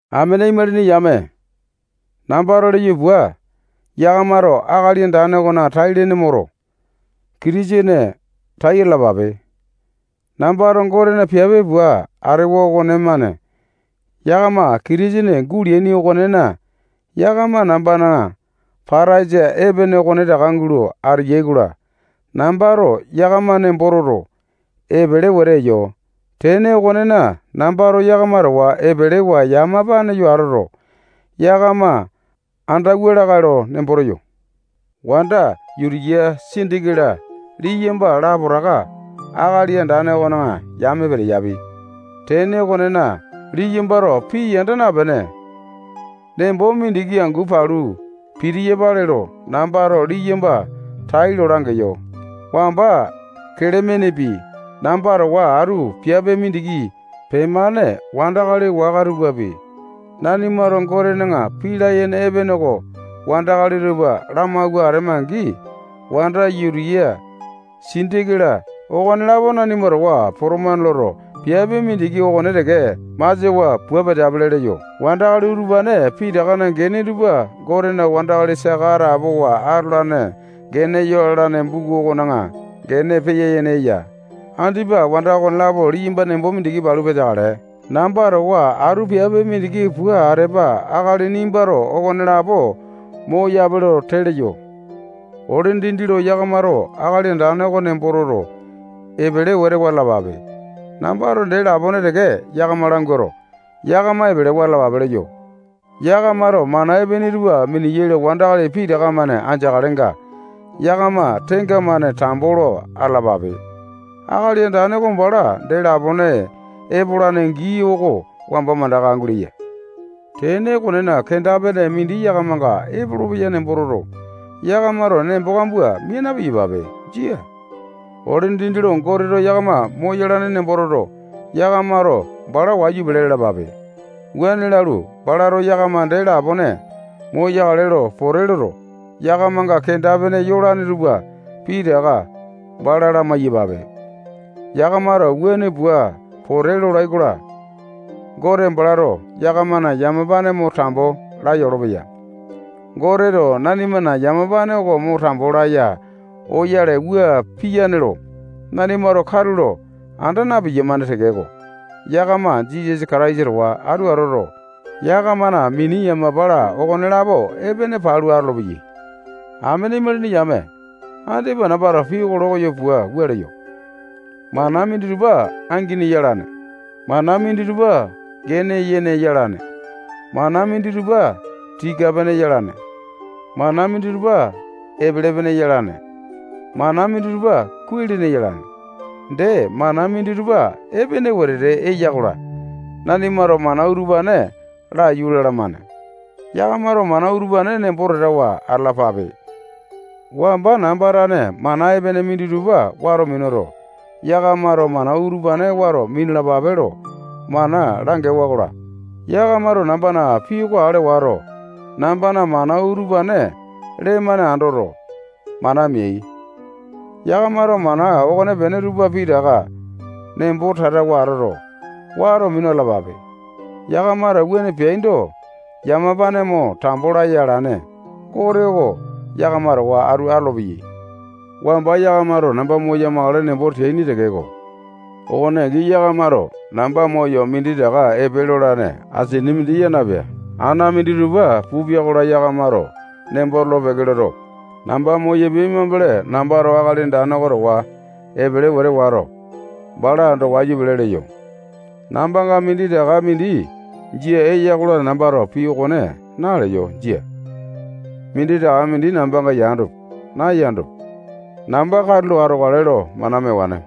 Amene imalini yame, nambato leyo pua, yakamato Akali Andane okone tai-lene moto, Kitisene tai atalapape. Nambato Gotena piape pua atewa okonemane yakama Kitisene guleaini okonena, yakama nambana pataisa epene okonetaka gulo ateyai-kola, nambato yakama nembo toto, epele wete eyo. Tene okonena, nambato yakama towa epelewa yamapane yo atoto, yakama andauwa lakae lo nembo teyo. Wanda Yutiya, Sindike-la liyamba lapotaka Akali Andane okona yame peteyapi. Tene okonena, liyambato pii yanda napene, nembo mindiki angu palu pitiyapale lo nambato liyamba tailo langeyo. Wamba Kelemenepi, namba towa atu piape mindiki pemane wandakali waka tupapi, nanimato Gotena pii layene epene oko wandakali tupa lamawua atema-angi, wanda Yutiya, Sindike-la, okonelapo nanima towa potomane loto, piape mindiki okone teke masiawa pua peteapili leyo. Wandakali utupane pitakana gene tupa Gotena wandakali saka atapowa atolane gene yalane buku okona gene peya-yene eya. Andipa wanda okonelapo liyamba nembo mindiki palu peteakale, namba towa atu piape mindiki pua atepa akali nimbato okonelapo moyape lo tee leyo. Ole dindi lo yakamato Akali Andane oko nembo toto, epele wete wa atalapape. Nambato dee lapone teke yakama languato, yakama epelewa atalapape leyo. Yakamato mana epene tupa miniyai lo wandakali pitaka-mane andeakalenga, yakama tenga-mane tambo lo atalapape. Akali Andane oko bala dee lapone epolane gii oko wamba mandaka guleya. Tene okonena, kenda-pene mindi yakamanga epolopeya nembo toto, yakamato nembo kambua mia na-piyapape. Jia. Ole dindi lo Goteto yakama moyalane nembo toto, yakamato bala wayu pele lalapape. Wuane lalu, balato yakama dee lapone moyakale lo pote loto, yakamanga kenda-pene yolane tupa pitaka bala lamai-yapape. Yakamato wuane pua pote lolai-kola, Gote balato yakamana yamapane mo tambo laya olopeya. Goteto nanimana yamapane oko mo tambo laya oyale wua piyane lo nanimato katulo anda na-piyamane tekeko, yakama Jisasa Kataisa towa atu atoto, yakamana mini yamapa-la, okonelapo epene palu atolopeyai. Amene imalini yame, andipa nambato pii oko lokoyo puato, wua leyo. Mana minditupa angini yalane. Mana minditupa gene yene yalane. Mana minditupa tika-pene yalane. Mana minditupa epele-pene yalane. Mana minditupa kuai-lene yalane. Dee, mana minditupa epene wete eya-kola, nanimato mana utupane laiyu lalamane. Yakamato mana utupane nembo tatawa atalapape. Wamba namba tane mana epene minditupa wato minuto, yakamato mana utupane wato minalapape lo mana langewa-kola, yakamato nambana pii oko ale wato, nambana mana utupane lee-mane andoto, mana meai. Yakamato mana okonepene tupa pitaka nembo tatawa atoto, wato minu atalapape. Yakamato wuane peaindo, yamapane mo tambo laya alane Gote oko yakama towa atu atolopeyai. Wamba yakamato namba moya-makale nembo teaini tekeko, okone angi yakamato namba moyo minditaka epe lolane asini mindi yaa napea. Ana minditupa pupia-kola, yakamato nembo tolo-peke loto, namba moyapia mambele, nambato Akali Andane oko towa epele wete wato, bala ando wayu pele leyo. Nambanga minditaka mindi jia eya-kola, nambato pii okone naleyo. Jia. Minditaka mindi nambanga yandopi, nayandopi, namba katulo atokale lo mana mewane.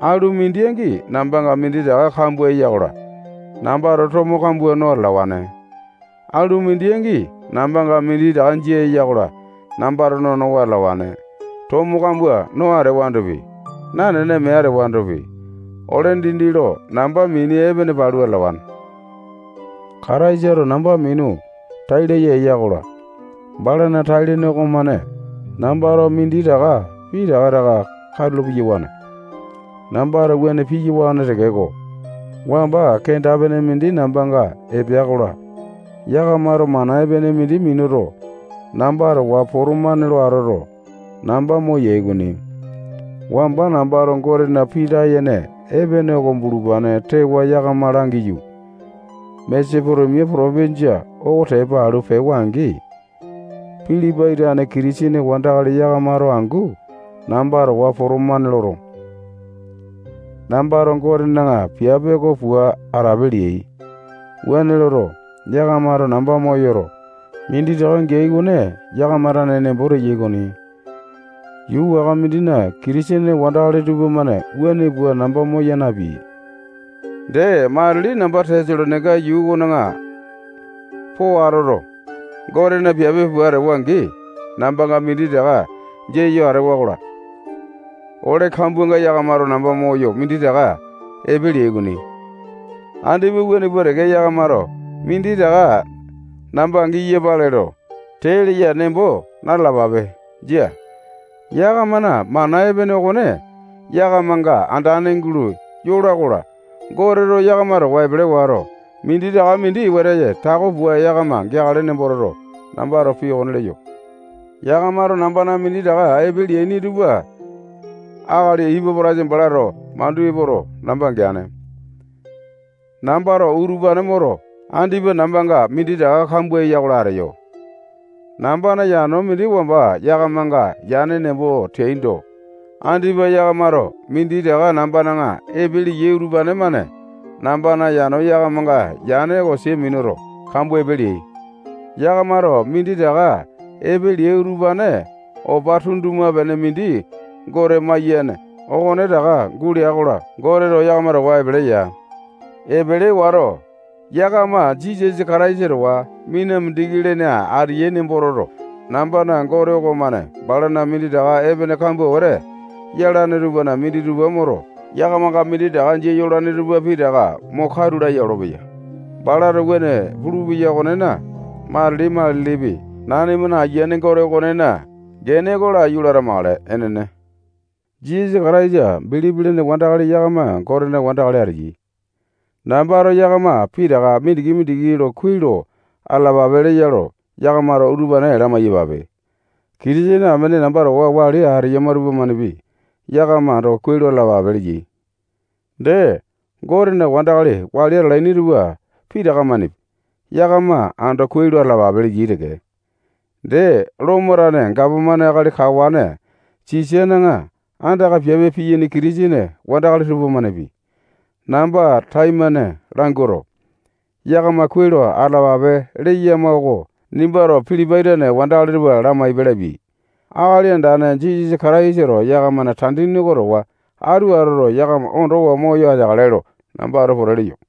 Alu mindi angi nambanga minditaka kambua eya-kola, nambato tomo kambua no atalawane. Alu mindi angi nambanga minditaka jia eya-kola, nambato nonowa atalawane. Tomo kambua no atewandopi, nanene mee atewandopi, ole dindi lo namba mini epene palu atalawane. Kataisato namba minu tai laya eya-kola, balana tai-lene okomane nambato minditaka pitaka taka katulo piyawane. Nambato wuane piyawane tekeko, wamba kenda-pene mindi nambanga epea-kola, yakamato mana epene mindi minuto, namba towa potomane lo atoto, namba moyai okoni. Wamba nambato Gotena pii layene epene oko bulupane tewa yakama langiyu, Masetonia potopinjia oko tepa alu pewa-angi, Pilipai tane Kitisene wandakali yakamato angu namba towa potomane loto, nambato Gotena piape oko pua atape leai. Wuane loto, yakamato namba moyoto, minditaka geai okone yakama tane nembo teyai okoni. Yuu waka mindina Kitisene wandakali tupamane wuane pua namba moya napeai. Dee, matili namba Tesalonaika yuu okona po atoto, Gotena piape pua atewa-angi, nambanga minditaka jia yo atewa-kola, ole kambuanga yakamato namba moyo minditaka epe leai okoni. Andipa wuane pua teke yakamato minditaka namba giyapale lo tee leya nembo na-talapape. Jia. Yakamana mana epene okone yakamanga andane gulo yola-kola, Goteto yakama towa epele wato, minditaka mindi wete tako pua yakama geakale nembo toto, nambato pii okone leyo. Yakamato nambana minditaka epe leaini tupa akali Ipapo-taitasa balato mandu epoto, namba geane. Nambato utupane moto, andipa nambanga minditaka kambua eya-kola, ateyo. Nambana yano mindi wamba yakamanga yane nembo teaindo, andipa yakamato minditaka nambana epe leai utupane-mane nambana yano yakamanga yane oko sia minuto, kambua epe leai. Yakamato minditaka epe leai utupane opa tunduma-pene mindi Gote maiyene okonetaka gulea-kola, Goteto yakama towa epele eya. Epele wato, yakama Jisasa Kataisa towa mina mindiki lene ateyai nembo toto, nambana Gote okomane balana minditaka epene kambua wete yalane tupana minditupa moto, yakamanga minditaka jia yolane tupa pitaka mo katu laya olopeya. Balato wuane pulupeya okonena, matili-matilipi, nanimana Ayiane Gote okonena gene oko laiyu lo atamakale. Enene. Jisasa Kataisa bilipi lene wandakali yakama Gotena wandakali ateyai. Nambato yakama pitaka mindiki-mindiki lo kuai lo atalapape leya lo yakamato utupane lamai-yapape. Kitisene amene namba towa wali ateyama tupamanepi yakama ando kuai lo atalapape leyai. Dee, Gotena wandakali wali atalaini tupa pitaka-manepi yakama ando kuai lo atalapape leyai teke. Dee, Lomo tane gapomane akali kawane Sisana andaka piape piyaini Kitisene wandakali tupamanepi, namba taimane languato, yakama kuai lo atalapape leyama oko nimbato Pilipai tane wandakali tupa lamaipe lapiai. Akali Andane Jisasa Kataisato yakamana tandini oko towa atu atoto, yakama ondowa moyo ateakale lo nambato pote leyo.